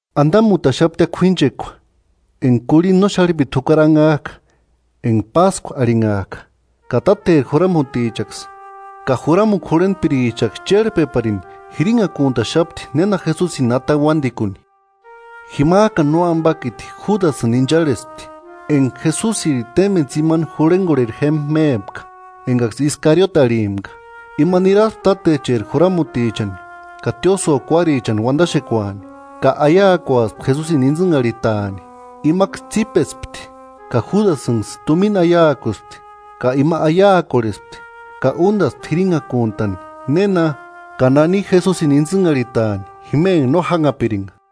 Andamutaxaptia k'uínchekua enga kurhinda no xarhipiti jukari anhajka enga Páskua arhinhajka. Ka tátecheri juramutichaksï ka juramukua jurhentpirichaksï chérhpeparini jirinhakuntaxapti néna Jesusini atani uándikuni. Jimajkani Nóambakiti Judasïni incharhespti, enga Jesusiri témbeni tsimani jurhengorheri jémba mépka, engaksï Iskariote arhimpka. Ima niraspti tátecheri juramutichani ka tiósïo kuarichani uandaxekuani, ka aiakuaspti Jesusini intsïnharhitaani. Imaksï tsípespti ka Judasïnksï tumina aiakuspti. Ka ima aiakorhespti ka úndaspti jirinhakuntani néna ka nani Jesusini intsïnharhitaani jima enga no jánhapiringa.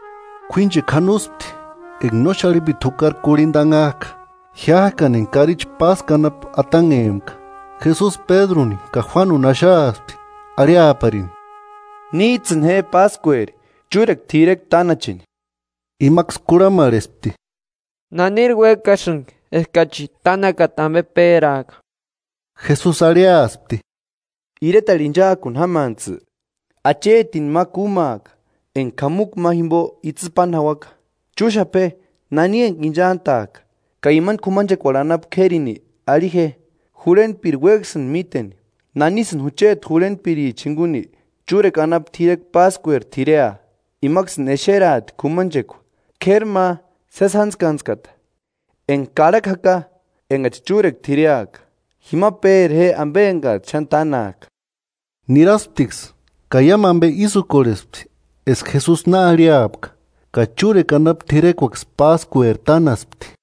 K'uínchekua janospti enga no xarhipiti jukari kurhinda anhajka, jiájkani enga karichi Páskua anapu atanhempka. Jesusi Pédruni ka Juánuni axaaspti, arhiaparini: –Níjtsïni je Páskueri chúrekua t'irekua tánacheni. Imaksï kurhamarhespti: –¿Naniri uéksïni eskachi tánakata ambe péraaka? Jesusi arhiaspti: –Iretarhu ínchaakuni jámantsï achetini ma kúmaaka enga k'amukua ma jimbo itsï páni jauaka. Chúxapa je nani enga inchantajka, ka imani k'umanchekuarhu anapu k'érini arhi je: Jurhentpiri uéksïndi míteni: ¿Nánisïni jucheti jurhentpirichani jinguni chúrekua anapu t'irekua Páskueri t'irea? Imaksïni exeraati k'umanchekua k'éri ma sési jántskantskata, enga karhakua jaka, engachi chúrekua t'ireaka. Jima péra je ambe engajtsï xáni tánajka. Nirasptiksï ka iámu ambe ísï úkorhespti eska Jesusi na arhiapka, ka chúrekua anapu t'irekuaksï Páskueri tánaspti.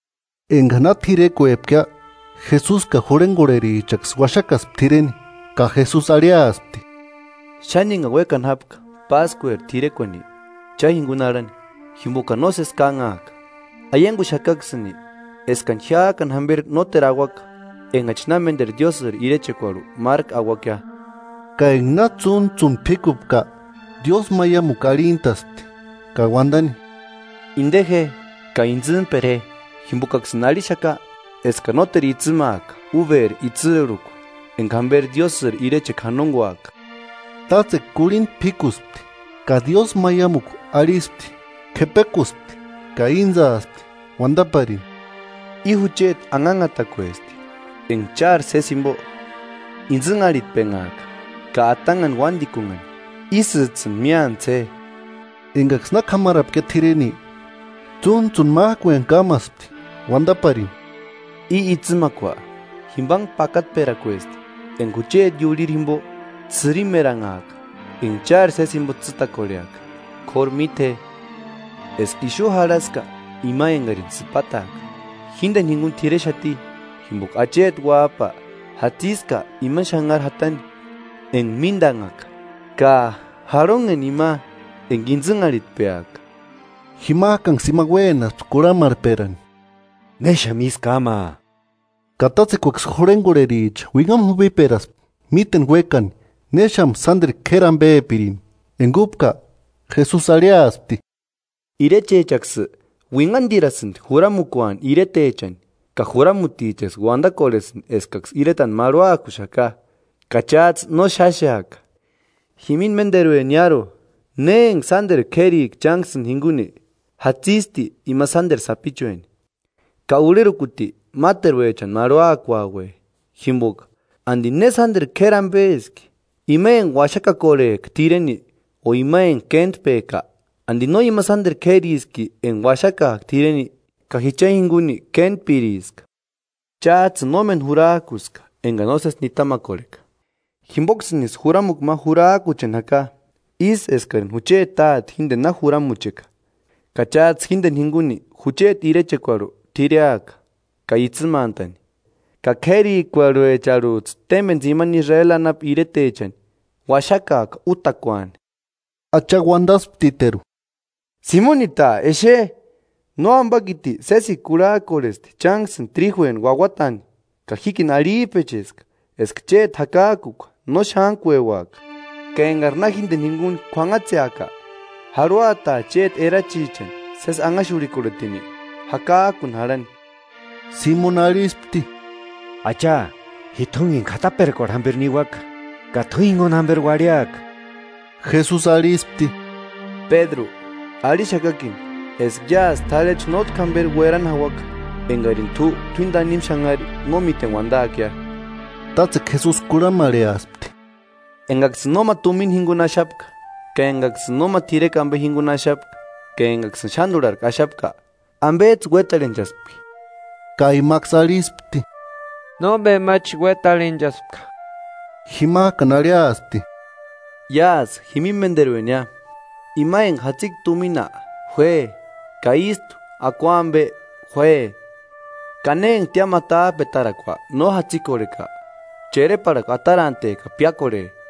Enga na t'irekuepkia, Jesusi ka jurhengorherichaksï uaxakaspti t'ireni. Ka Jesusi arhiaspti: –¡Xáni engani uékani jápka Páskueri t'irekuani cha jinguni arhani, jimbokani nósesi kánhaaka! Aianguxakaksïni eskani jiájkani jamberi nóteru auaka, engachi na ménderu Diósïri irechekuarhu márku auakia. Ka enga na tsúntsuni p'íkupka, diósmaiamukua arhintaspti, ka uandani: –Inde je ka intsïmpera je; jimbokaksïni arhixaka eskani nóteru itsïmaaka uberi itsïrhukua enga jamberi Diósïri irechekua janonguaaka. Tátsekua kurhinda p'íkuspti ka diósmaiamukua arhispti, k'epekuspti ka íntsaaspti, uandaparini: –I jucheti anhanhatakuesti, enga chári sési jimbo intsïnharhitpenhaaka ka atanhani uándikunhani. Ísïjtsïni míantsï je. Engaksï na k'amarapkia t'ireni, tsúntsuni májkueni kámaspti, uandaparini: –I itsïmakua jimbanhe pakatperakuesti enga jucheti iurhiri jimbo ts'ïrimeranhaka, enga chári sési jimbo tsîtakorheaka. K'óru míte je, eska ixu jarhaska ima engarini sïpataaka, jíndeni jinguni t'irexati. Jimboka acheti Uájpa jatsiska imani xanharini jatani enga míndanhaka ka ¡Jarhonheni ima enga intsïnharhitpeaka! Jimajkanksï ima uénaspti kurhamarhperani: –¿Néxamu ísï kámaa? Ka tátsekuaksï jurhengorhericha uinhamu jupiperaspti míteni uékani néxamusï sánderu k'éri ambepirini. Enga úpka, Jesusi arhiaspti: “Irechechaksï uinhandirasïndi juramukuaani iretechani ka juramutichaksï uandakorhesïndi eskaksï iretani marhuakuxaka. Ka chájtsï no xáxeaka. Jimini ménderueniaru, ne enga sánderu k'érika chánksïni jinguni jatsisti ima sánderu sapichueni, ka urherukuti máteruechani marhuakuaue. Jimboka ¿Andi ne sánderu k'éri ambeski? ¿Ima enga uaxakakorhejka t'ireni o ima enga kéntpejka? ¿Andi no ima sánderu k'ériski enga uaxakajka t'ireni? Ka ji cha jinguni kéntpiriska.” “Chájtsïni nómeni jurajkuska engani nósesi nitamakorheka. Jimboksïnisï juramukua ma jurajkucheni jaka, ísï eskarini jucheti Táte jíndeni na juramucheka, ka chájtsï jíndeni jinguni jucheti irechekuarhu t'ireaka ka itsïmantani, ka k'érikuarhuecharhujtsï témbeni tsimani Israeli anapu iretechani uaxakaaka útakuani.” Acha uandasptiteru: –¡Simonita! Exe, Nóambakiti sésikua kurhajkorhesti chánksïni tríjueni uauatani; ka jíkini arhijpecheska, eska chéti jakajkua no xántkueuaka. Ka engari na jíndeni jinguni k'uanhatseaka, jarhuataa chéti erachichani sési anhaxurhikorhetini jakajkiuni jarhani. Simoni arhispti: –Acha, t'u jinguni k'ataperakuarhu jamberi niuaka, ka t'u jinguni jamberi uarhiaka. Jesusi arhispti: –Pédru, arhixakakini eska iásï t'arhechu nótki jamberi uerani jauaka, engarini t'u t'uíni tanimu xanhari no míteni uandaakia. Tátsekua Jesusi kurhamarheaspti: –Engaksïni nóma tumina jinguni axapka, ka engaksïni nóma t'irekua ambe jinguni axapka, ka engaksïni xándurharku axapka, ¿Ambejtsï uétarhenchaspki? Ka imaksï arhispti: –Nóma ambechi uétarhenchaspka. Jimajkani arhiaspti: –Iásï jimini ménderuenia, ima enga jatsika tumina juáe, ka ístu akua ambe juáe; ka ne enga tiámu atajpetarakua no jatsikorheka, chereparhakua atarante ka piákorhe.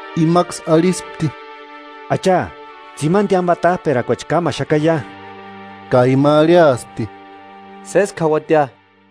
Imaksï arhispti: –Acha, tsimani tiámu atajpetarakuachi kámaxakaia. Ka ima arhiaspti: –Sésku jauatia.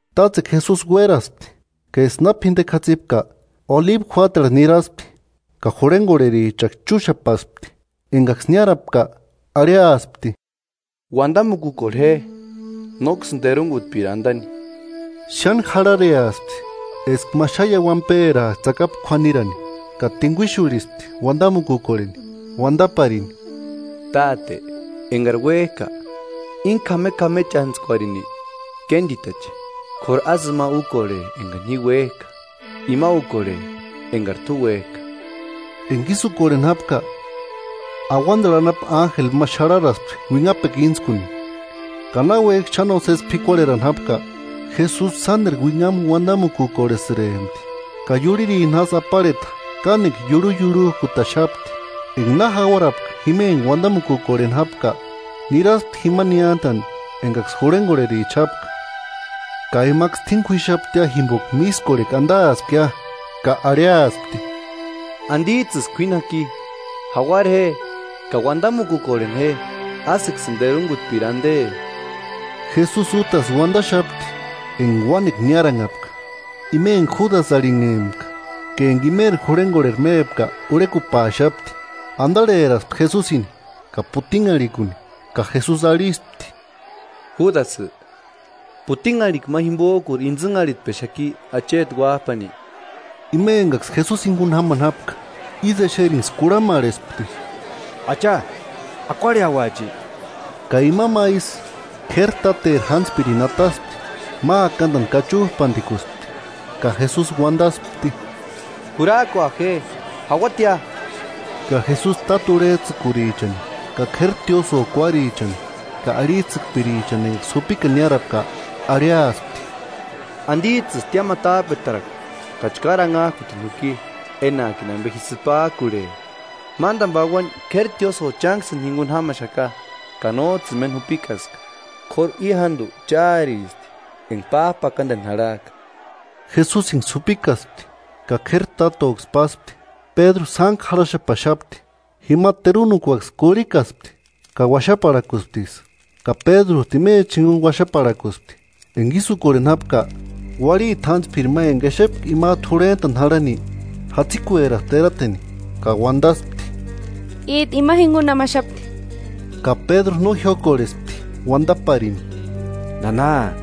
Tátsekua Jesusi uéraspti, ka eska na p'indekua jatsipka, Olibu juátarhu niraspti; ka jurhengorherichaksï chúxapaspti Engaksï niárapka, arhiaspti: –Uandamukukorhe je, nóksïni terungutpiri andani. Xáni jarhareaspti eska ma xáni iauiani pérajka tsakapu k'uanirani, ka tinguixurhispti uandamukukorheni. Uandaparini: “Táte, engari uéjka, íni k'amek'amechantskuarini kénditache; k'óru ásï ima úkorhe engani ji uéjka, ima úkorhe engari t'u uéjka.” [Enga ísï úkorheni jápka, auandarhu anapu ánjeli ma xarharaspti uinhapekua íntskuni. Ka náuejki xáni nósesi p'ikuarherani jápka, Jesusi sánderu uinhamu uandamukorhesïrempti, ka iurhirini jásï aparheta kánekua iurhuiurhujkutaxapti.] Enga na jauarapka jima enga uandamukukorheni jápka, niraspti jima niántani engaksï jurhengorhericha jápka, ka imaksï t'uíni k'uíxaptia jimboka mískorhekua andaaspkia ka arhiaspti: –¿Andijtsïsï k'uíni jaki? Jauara je ka uandamukukorheni je, ásïksïni terungutpiri ande. Jesusi útasï uandaxapti, enga uánekua niáranhapka. Ima enga Judasï arhinhempka ka enga imeri jurhengorheri mépka urhekupaaxapti. Andarheraspti Jesusini ka putinharhikuni, ka Jesusi arhispti: –Judasï, ¿Putinharhikua ma jimbojkuri intsïnharhitpexaki Acheti Uájpani? Ima engaksï Jesusini jinguni jámani jápka, ísï exerinksï kurhamarhespti: –Acha, ¿Akuarheauachi? Ka ima ma isï k'éri táteri jántspirini ataspti, ma akandani kachujpandikuspti. Ka Jesusi uandaspti: –Jurajkua je jauatia. Ka Jesusi táta urhejtsïkurichani ka k'éri tiósïo kuárichani ka arhijtsïkpirichani engaksï jupikani niárapka arhiaspti: –¿Andijtsïsï tiámu atajpetarakua ka chkári anhajkutini juki, enajkini ambe ji sïpajkurhe? Mándani pauani k'éri tiósïo chánksïni jinguni jámaxaka, ka nójtsïni méni jupikaska. K'óru i jándu cháristi, enga pájpakandeni jarhajka. Jesusinksï jupikaspti ka k'éri tátoksï páspti. Pédru sántku jarhaxapaxapti. Jima terunukuaksï kurhikaspti, ka uaxaparhakusptiksï; ka Pédrujtu imechani jinguni uaxaparhakuspti. Enga ísï úkorheni jápka, uarhiti jántspiri ma enga exepka imajtu jurhentani jarhani jatsikueraspti erateni ka uandaspti: –Íjtu ima jinguni jámaxapti. Ka Pédru no jiókorhespti uandaparini: –Nana,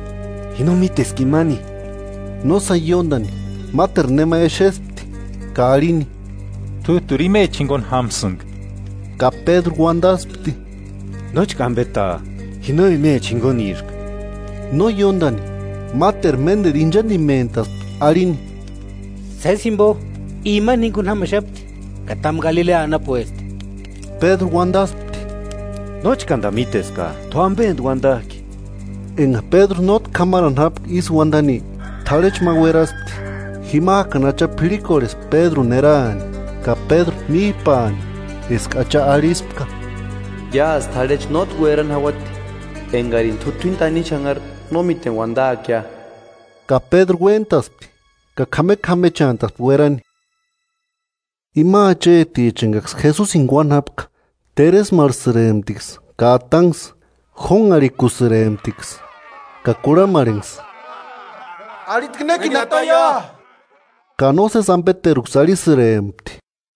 ji no míteska imani. No sáni ióndani, máteru nema exespti ka arhini: –T'újturi imechani jinguni jámsïnga. Ka Pédru uandaspti: –Nóchka ambeta, ji no imecha jinguniska. No ióndani, máteru ménderu inchandimentaspti arhini: –Sési jimbo i imani jinguni jámaxapti. Ka támu Galilea anapuesti. Pédru uandaspti: –Nóchkanda míteska, t'u ambendi uandajki. Enga Pédru nótki k'amarani jápka ísï uandani, t'arhechu ma ueraspti. Jimajkani Acha p'irhikorhespti Pédruni erani, ka Pédru míjpaani eska Acha arhispka: “Iásï t'arhechu nótki uerani jauati engarini t'u t'uíni tanimu xanhari no míteni uandaakia.” Ka Pédru uéntaspti, ka k'amek'amechantaspti uerani. Ima acheticha engaksï Jesusini kuáni jápka teresmarhusïremptiksï ka atanksï. Jónharhikusïremptiksï ka kurhamarhenksï: –¿Arhitki nékini ataia? Ka nósesi ambeteruksï arhisïrempti.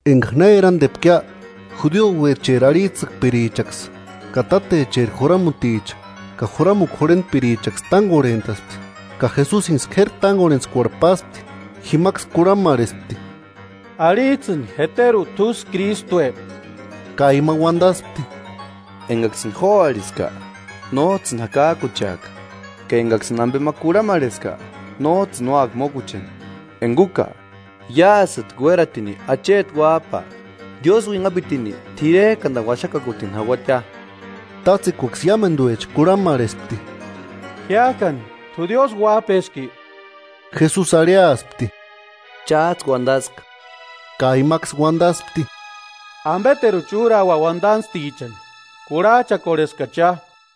Enga na erandepkia, judiouecheri arhijtsïkpirichaksï ka tátecheri juramuticha ka juramukua jurhentpirichaksï tángorhentaspti, ka Jesusinksï k'éri tángorhentskuarhu páspti. Jimaksï kurhamarhespti: 67–Arhijtsïni, ¿Jeteru t'úsï Krístue? Ka ima uandaspti: –Engaksïni jo arhiska, nójtsïni jakajkucheaka. Ka engaksïni ambe ma kurhamerheska, nójtsïni úaka mókucheni. Enga úka, iásïtki uératini acheti Uájpa, Diósï uinhapitini t'irejkandani uaxakakutini jauatia. Tátsekuaksï iámenduecha kurhamarhespti: –Jiájkani, ¿T'u Diósï uájpeski? Jesusi arhiaspti: –Chájtsï uandaska. Ka imaksï uandaspti: –¿Ambeteruchi úraua uandantstichani? Kurhajchakorheskachia.